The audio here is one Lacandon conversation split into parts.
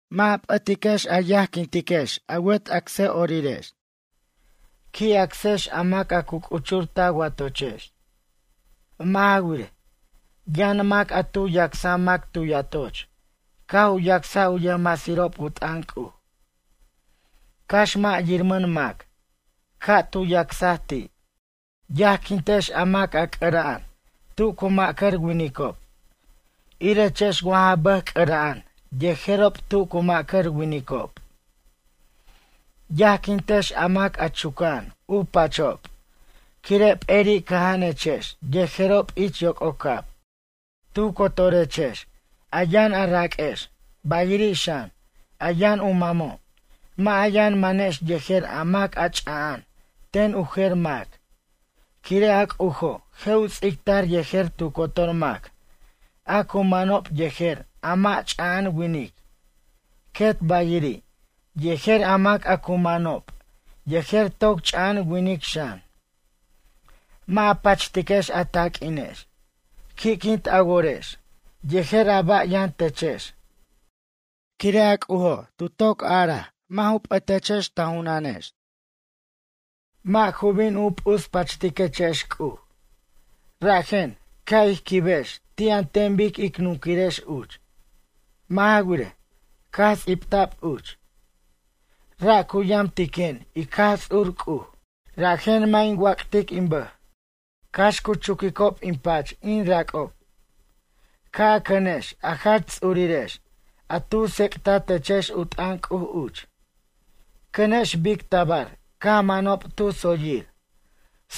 Mʌ' a p'atiquex a yajquintiquex a wet acsʌ'orirex. Qui' acsex a mac a cu c'uchur ta watochex. Mʌ' ja wirej, yʌn mac a tu yacsaj mac tu yatoch caj u yacsaj u yʌjmasirob u t'ʌn C'uj, cax mʌ' yirmʌn mac, ca' tu yacsaj ti'. Yajquintex a mac a c'ʌra'an tu cu ma'cʌr winicob irechex wa ja bʌj c'ʌra'an yejerob tu cu ma'cʌr winicob. Yajquintex a mac chuca'an u pachob quire' peri' cʌja'anechex yejerob ich yoc'ocab. Tu cotorechex, a yʌn a raq'uex, bayiri' xan, a yʌn u mamo', mʌ' a yʌn manex yejer a mac ch'aja'an ten u jer mac quire' a C'ujo' je' u ts'ictar yejer tu cotor mac a cu manob yejer a mʌ' ch'a'an winic, quet bayiri', yejer a mac a cu manob yejer toc ch'a'an winic xan. Mʌ' a pachtiquex a taq'uinex. Qui'quint a worex yejer a ba' yʌn techex, quire' a C'ujo' tu toc araj mʌ' u p'ʌtechex ta junanex, mʌ' ju bin u p'uspachtiquechex C'uj. Rajen, ca' ij qui' quibex ti' an ten bic ic nunquirex uch. Mʌ' ja wirej, caj ts'ibta'b uch: Ra' cu yamtiquen in Jaj Ts'ur C'uj, rajen mʌ' in wac'tic in bʌj, cax cu chuquicob in pach in rac'ob. Ca' a cʌnex a jach ts'urirex a tu tsec'tatechex u t'ʌn C'uj uch. Cʌnex bic tabar caj manob tu tsoyir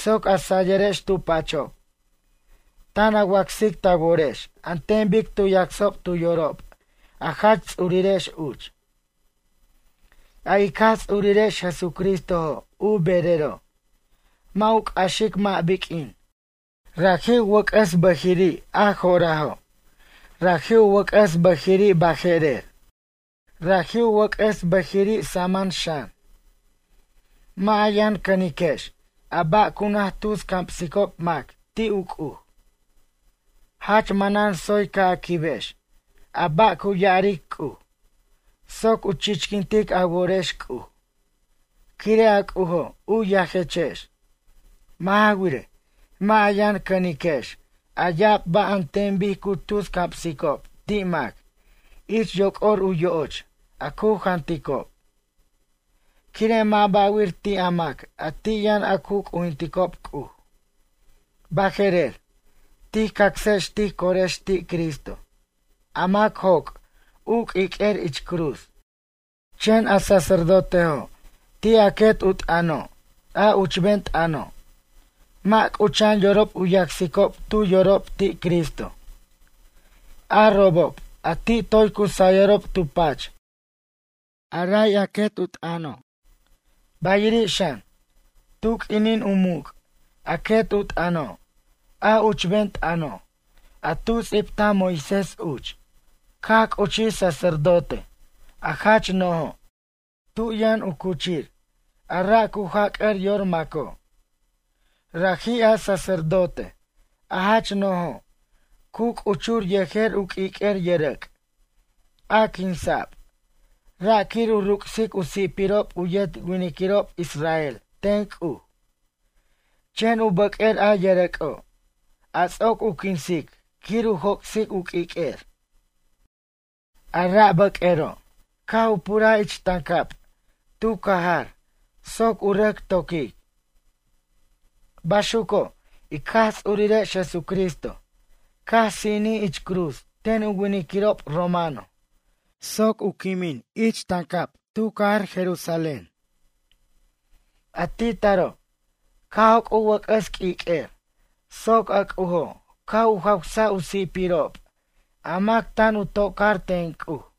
soc a sayʌrex tu pachob, tan a wacsic ta worex an ten bic tu yacsob tu yorob a jach ts'urirex uch. A ic Jaj Ts'urirex Jesucristojo' u berero', mʌ' u c'axic mʌ' biq'uin, raji' u wʌc'ʌs bʌjiri' a jo'rajo', raji' u wʌc'ʌs bʌjiri' baje'rer, raji' u wʌc'ʌs bʌjiri' saman xan. Mʌ' a yʌn cʌniquex a ba' a cu naj tus camsicob mac ti' u C'uj. Jach manan tsoy ca' a quibex a ba' cu ya'aric C'uj soc u chichquintic a worex C'uj, quire' a C'ujo' u yajechex. Mʌ' ja wirej, mʌ' a yʌn cʌniquex a ya'ab ba' an ten bic cu tus camsicob ti' mac ich yoc'or u yo'och a cu janticob. Quire' mʌ' ba'wir ti' a mac a ti' yʌn a cu c'ujinticob C'uj. Baje'rer tij cacsex tij corex ti' Cristo a mac joc' u q'uiq'uer ich cruz. Chen a sacerdotejo' ti' a quet u t'ʌno', a uchben t'ʌno', mʌ' c'ucha'an yorob u yacsicob tu yorob ti' Cristo, a robob a ti' toy cu sayʌrob tu pach a ray u quet u t'ʌno'. Bayiri' xan, tu q'uinin u muc' a quet u t'ʌno', a uchben t'ʌno', a tu ts'ibtaj Moisés uch, caj c'uchij sacerdote, a jach no'jo' tu yʌn u cuchir a ra' cu jac'ʌr yor maco'. Raji' a sacerdote, a jach no'jo' cu c'uchur yejer u q'uiq'uer yʌrʌc', a quinsa'b, ra' quir u ruc'sic u si'pirob u yet winiquirob israel ten C'uj. Chen u bʌq'uer a yʌrʌc'o', a ts'oc u quinsic quir u joc'sic u q'uiq'uer. A ra' bʌq'uero', caj u puraj ich tancab tu cajar soc u rʌc to'quic. Baxuco', ic Jaj Ts'urirex Jesucristo caj sinij ich cruz ten u winiquirob romano soc u quimij ich tancab tu cajar Jerusalén. A ti' taro', caj joc' u wʌc'ʌs q'uiq'uer soc a C'ujo' caj u jawsaj u si'pirob a mac tan u tocar ten C'uj.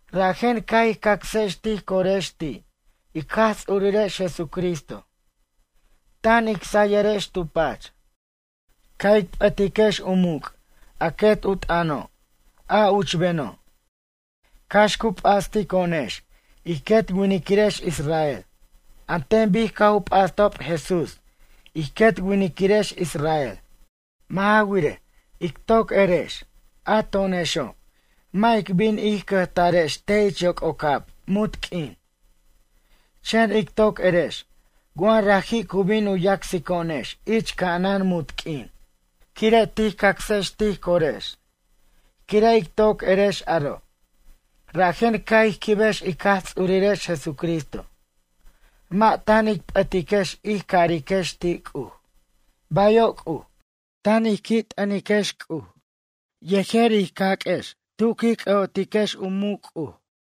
Rajen ca' ij cacsex tij corex ti' ic Jaj Ts'urirex Jesucristo tan ic sayʌrex tu pach. Ca' ic p'ʌtiquex u muc' a quet u t'ʌno', a uchbeno', cax cu p'astico'onex ij quet winiquirex israel an ten bic caj u p'astob Jesús ij quet winiquirex israel. Mʌ' ja wirej, ic toc erex, a to'onexo', mʌ' ic bin ij cʌjtarex te' ich yoc'ocab munt q'uin. Chen ic toc erex wa raji' cu bin u yacsico'onex ich ca'anan munt q'uin quire' tij cacsex tij corex. Quire' ic toc erex aro', rajen ca' ij quibex ic Jaj Ts'urirex Jesucristo, mʌ' tan ic p'ʌtiquex ij cariquex ti' C'uj: “Bayo' C'uj”, tan ij qui' t'ʌntiquex C'uj yejer ij caq'uex tu quij c'ʌ'otiquex u muc' C'uj.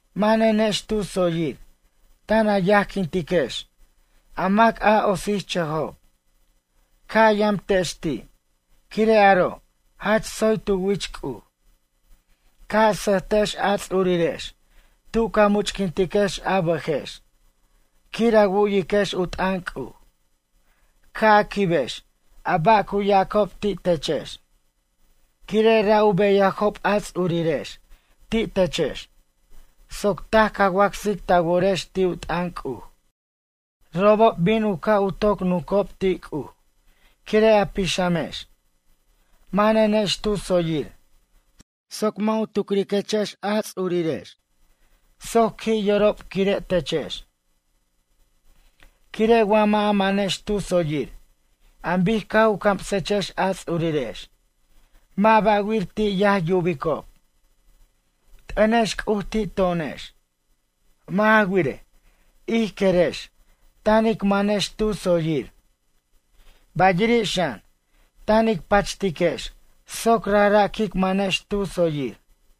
Manenex tu tsoyir tan a yajquintex a mac a otsichʌjob, ca' a yamtex ti' quire' aro' jach tsoy tu wich C'uj. Ca' a sʌjtex a ts'urirex tu ca much'quintiquex a bʌjex quir a wu'iquex u t'ʌn C'uj. Ca' a quibex a ba' cu ya'acob ti' techex, quire' ra' u beyajob a ts'urirex, ti' techex, soc taj ca wacsaj ta worex ti' u t'ʌn C'uj. Robob bin u ca' u toc nuncob ti' C'uj quire' a pixamex. Manenex tu tsoyir soc mʌ' u tucriquechex a ts'urirex soc qui' yorob quire' techex. Quire' wa mʌ' a manex tu tsoyir an bic caj u camsechex a ts'urirex, mʌ' ba'wir ti' yaj yubicob. T'ʌnex C'uj ti' to'onex. Mʌ' ja wirej, ij querex tan ic manex tu tsoyir. Bayiri' xan, tan ic pachtiquex soc rajra' quic manex tu tsoyir.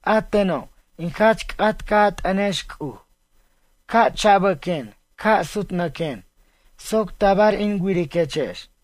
A teno' in jach c'at ca' a t'ʌnex C'uj ca' chabʌquen ca' sutnʌquen soc tabar in wiriquechex.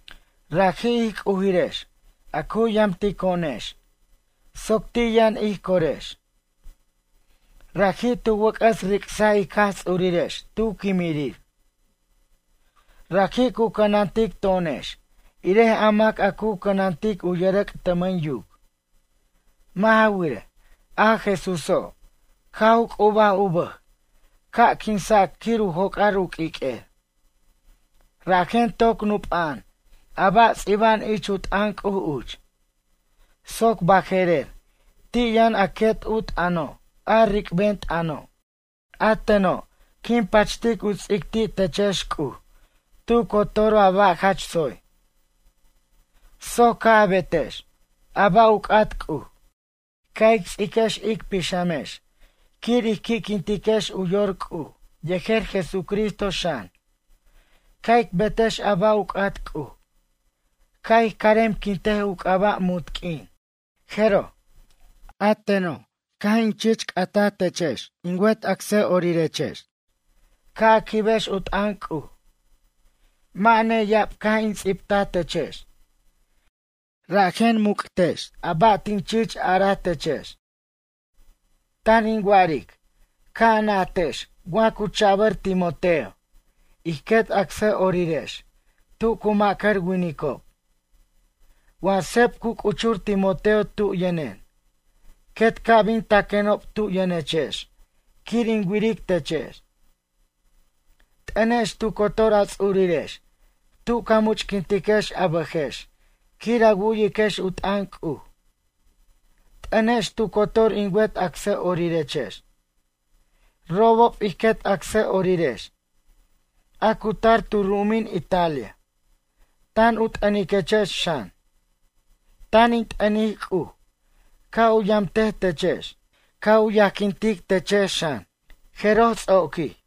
Raji', ij C'ujirex, a cu yamtico'onex, soc ti' yʌn ij corex. Raji' tu wʌc'ʌs ric'saj ic Jaj Ts'urirex tu quimirir. Raji' cu cʌnantic to'onex irej a mac a cu cʌnantic u yʌrʌc' tʌmʌn yuc. Mʌ' ja wirej, a Jesúso', caj u c'ubaj u bʌj ca' quinsac quir u joc'ar u q'uiq'uer. Rajen toc nup'a'an a ba' ts'iba'an ich u t'ʌn C'uj uch, soc baje'rer ti' yʌn a quet u t'ʌno', a ric'ben t'ʌno'. A teno' quin pachtic u ts'ic ti' techex C'uj tu cotor a ba' jach tsoy, soc ca' a betex a ba' u c'at C'uj. Ca' ic ts'iquex ic pixamex quir ij qui'quintiquex u yor C'uj yejer Jesucristo xan, ca' ic betex a ba' u c'at C'uj, ca' ij caremquintej u c'aba' munt q'uin. Jeroj. A teno' caj in chich c'ataj techex in wet acsʌ'orirex ca' a quibex u t'ʌn C'uj. Mʌ' neya'ab caj in ts'ibtaj techex, rajen muc' techex a ba' tin chich araj techex. Tan in wa'aric ca' a najtex wa cu cha'bʌr Timoteo ij quet acsʌ'orirex tu cu ma'cʌr winicob. Wa seb cu c'uchur Timoteo tu yʌnen, quet ca' bin taquenob tu yʌnechex quir in wiric techex. T'ʌnex tu cotor a ts'urirex tu ca much'quintiquex a bʌjex quir a wu'yiquex u t'ʌn C'uj. T'ʌnex tu cotor in wet acsʌ'orirechex. Robob ij quet acsʌ'orirex, a cu tar tu ru'umin Italia, tan u t'ʌniquechex xan. Tan in t'ʌnic C'uj ca' u yamtej techex, ca' u yajquintic techex xan, jeroj ts'oquij.